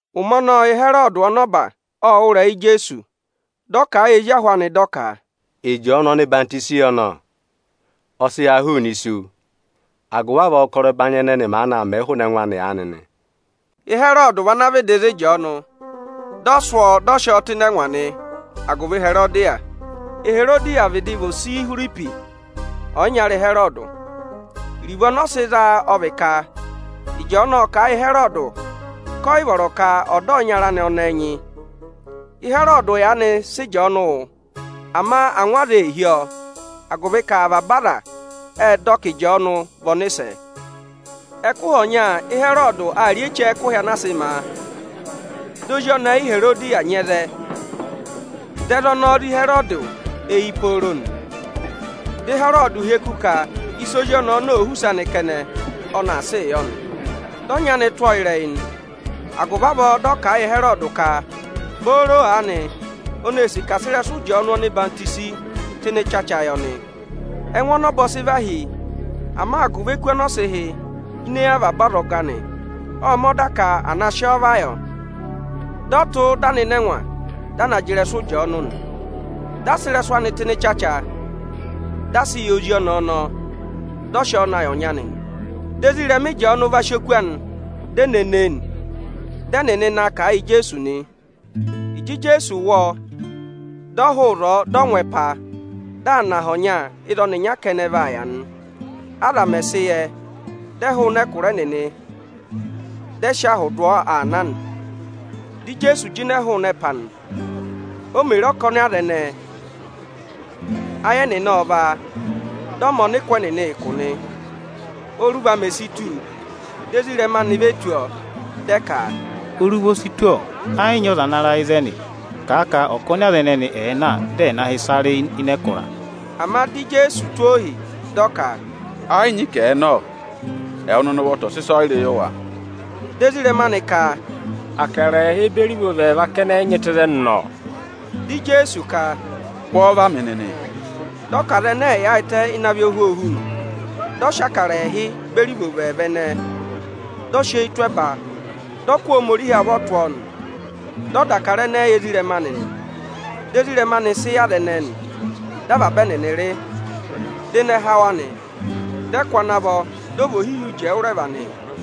Ụmẹ ọnọọ Ịhẹrọdị ọnọba ộ wụ́ ịrẹyị Ijeesu. Dị ọ kà a yị ezi ahụ anị dị ọ ka, “Ịjọọnụ ọhwọzenyi yọ nọ! Ọ sị ha hụụnị isu; agụvị avọọ ụkọrọ ẹbanyị ẹnẹnị maanị aa mẹẹ hụụnị ẹngụ anị aanị.” Ịhẹrọdị vị ana vịdị za Ịjọọnụ, dị ọ sụ́ ọọ dị ọ sị ọọ tụ́ ịnị ẹngwa nị agụvị Iherodiya. Iherodiya vịdị vị ose Ihwiripi, ọyịnyara Ịhẹrọdị. Iruvo ọnọọ sị zaa ọ vị ka Ịjọọnụ ộ kà a yị Ịhẹrọdị ka ọ yị vọrọ ka ọ̀ dọ ọyịnyara anị ọnẹẹ nyị. Ịhẹrọdị yaanị sị Ịjọọnụ wụ, ama angwa aza ee hí ọọ, agụvị ka avaba aza ệ dọ ka Ịjọọnụ vị ọnịsẹ. Ẹkụhị ọnya Ịhẹrọdị aa rị eche ẹkụhị anaa sị ma a. Di ozi ọnẹẹ Iherodiya nyị ẹzẹ, dị ẹzẹ ọnọọ zé Ịhẹrọdị eyi pooro nị. Dị Ịhẹrọdị hyeku ka ịsị ozi ọnọọ òo họ̀ use anị kẹnẹ, ọnị aa sịị yọ nị. Dị ọnyị anị tụ́ ọ ịrẹyị nị; agụvị avọọ dị ọ kà a yị Ịhẹrọdị ka, booro aanị oni ee sì ka à sị ịrẹsụ Ịjọọnụ ọhwọzenyi tụ́ ịnị ịchacha yị ọnị. Ẹngụ ọnọba ọ sị vahi, ama agụvị eku ọnị ọ sị hị́ ini eyi avaba ọzọga anị, ộ mẹ̀ ọda ka à na sị ọ va yọ. Dị ọ tụ́, dị a nọ ịnị ẹngwa, dị a na jị ịrẹsụ Ịjọọnụ nị. Dị a sị ịrẹsụ anị tụ́ ịnị ịchacha, dị a sị yị ozi ọnẹẹ ọnọọ, dị ọ sị ọ na yị ọnyị anị nị. Dị ezirẹma Ịjọọnụ va sị oku anị, di e ne ne e nị; dị ẹnịnị na kà a yị Ijeesu nị. Ịjị Ijeesu wụ́ ọ, dị ọ hụụ ịzọọ, dị ọ ngụ ẹpa, dị aa nọ aha ọnya ịzị ọnịnya kẹnẹ vaa yà nị. Aza mẹ̀ sị yẹ, dị ẹ hụrị ẹkụra ẹnịnị, dị ẹ sị ahụ dụ ọ aa na nị. Dị Ijeesu jịnẹ hụụnị ẹpa nị. O mè re ọkọnị aza ẹnẹẹ, ayị ẹnịnị ộ vá a, dị ọ mẹ ọnịkụ ẹnịnị ụkụ nị. Óruva mè si tù, di ezirẹma anị ve tù ọọ, dị ẹ ka, “Oruva o si tù, ọ. Ẹ yị nyị ọza ana ra ịzẹnị. Kà a ka ọkọnị aza ẹnẹnị ẹ̀ẹ na, dị ẹ̀ na hị́ ịsa rị ịnị ẹkụra!” Ama di Ijeesu tụ́ ohi, dị ọ ka, “Ẹ yị nyị ka ẹ̀ na, ọ! Ẹwụ nịnị ụvọta ọ̀ sị ịsọyịrị yị wa!” Dị ezirẹma anị ka, “Akara ẹẹhị beri ivovo ẹẹva kẹnẹ ị nyị tụ́ ịzẹnị nọ.” Dị Ijeesu ka, “Kụ́ ọọ va mị nịnị!” Dị ọ ka aza ẹnẹẹ ẹ̀ yaayịtẹ ịnị avị ohwoohu nị. Dị ọ sị Ịbụrẹẹdị ẹẹhị beri ivovo ẹẹva ẹnẹẹ, dị ọ sị eyi tụ́ ẹba, dị ọ kụ́ Ohomorihi avọ tụ́ ọọ nị. Dị ọ dà Ịbụrẹẹdị ẹnẹẹ yị ezirẹma anị, dị ezirẹma anị sị yị aza ẹnẹẹ nị. Dị avaba ẹnịnị rị, dị ịnẹ há wa nị. Dị ẹ kụ́ ana vọ, dị ọ vị ohihi uji ẹwụrẹva nị.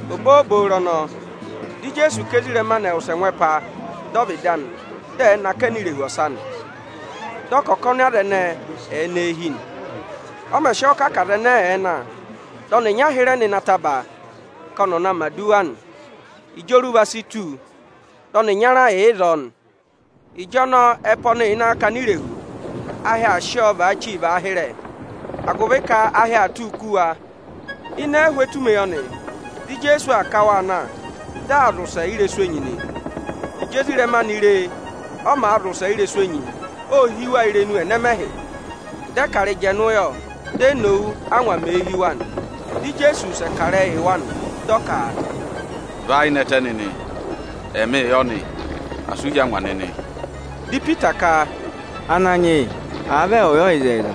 Obooboro ọnọọ, dị Ijeesu ka ezirẹma anị ẹ̀ wụsẹ ngụ ẹpa dọ ọvịdị anị, dị ẹ̀ẹ nọ akẹnẹ irehu ọsa nị. Dị ọ ka ọkọnị aza ẹnẹẹ ẹ̀ẹ nọ eehi nị. Ọ mẹ̀ sị ọọ kà ka aza ẹnẹẹ ẹ̀ẹ na, dị ọnịnya hịrẹ nọ ịnị ataba ka ọnị ọ̀ na mẹ̀ aduwa nị. Ịjị oruva si tù, dị ọnị ịnyara yà ịzọọ nị. Ịjọnọọ ẹpa ọnị yà ịnị akakana irehu, ahị aa sị ọọ vaachi vaa hịrẹ, agụvị ka ahị aa tụ́ụ kú wa. Ịnị ẹhụụ etumeyọnị, dị Ijeesu aa ká waa na, dị aa zị ụsẹ ị́rẹsụ enyi nị. Ịjị ezirẹma anị re e, ọ màa zị ụsẹ ị́rẹsụ enyi, ô hí wa irenu ẹnẹmẹhị. Dị ẹ ka arịjẹnụ yọ. Di e nowu, ángwa mèe hí wa nị. Dị Ijeesu wụsẹ kà ịrẹyị yị wa nị, dị ọ ka, “Và ayị nẹtẹ nịnị! Ẹmịị yọ nị, asị u hí angwa nịnị!” Dị Ipita ka, “Ananyị yị, àa vị ẹwụụ yọ ịzẹyịza,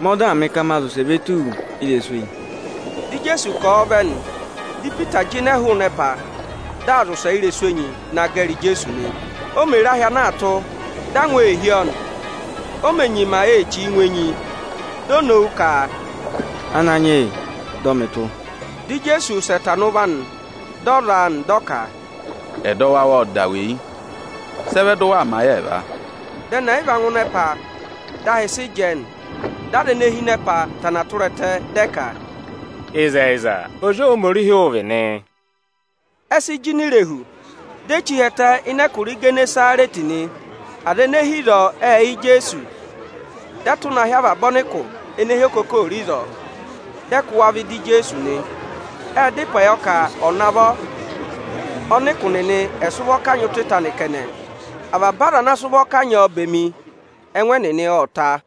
mẹ ọdaa mị ka ma zị ụsẹ ve tù wu ị́rẹsụ enyi!” Dị Ijeesu kà ọọ vẹ nị. Dị Ipita jịnẹ hụụnị ẹpa, dị aa zị ụsẹ ị́rẹsụ enyi naa gẹrị Ijeesu nị. Ama ô mè re ahị maa tụ kukuku, dị angwa hí ọ, di o nyima ee chíi ngụ enyi nị, di o nowu ka, “Ananyị yị, dọ mị tụ́!” Dị Ijeesu wụsẹ tana ụvọ anị, dị ọ za a nị. Dị ọ kà, “Ẹdọwụ awụ ộ da weyi kẹnẹ. Sị ẹ vẹ dị ụ waa mẹ ayị ẹẹva?” Dị ẹnị ẹyịva ngụ ịnị ẹpa, dị ahị sị jẹẹ nị. Dị aza ene hi ịnị ẹpa va ku ẹtẹ, dị ẹ ka, “Ịzẹyịza, Ozi Ohomorihi ụ vị nị.” Ẹ sị jịnẹ irehu, di e chí hi ẹtẹ ịnị ẹkụra Igenesarẹtị nị. Aza ene hi ịzọọ ệ yẹ Ijeesu. Dị ẹ tụ́ na hị́ avaba ọnịkụ ene hi okokooro ịzọọ, dị ẹ kụ́ wa vẹ ịda Ijeesu nị. Ệ dá ịpẹ yọ ka ọ̀ navọ ọnịkụ nịnị ẹ̀ sị ụvọ kanyị ụtọ ịta anị kẹnẹ. Avaba aza ana sị ụvọ kanyị ọọ bemi, ẹngụ ẹnịnị ộ ta.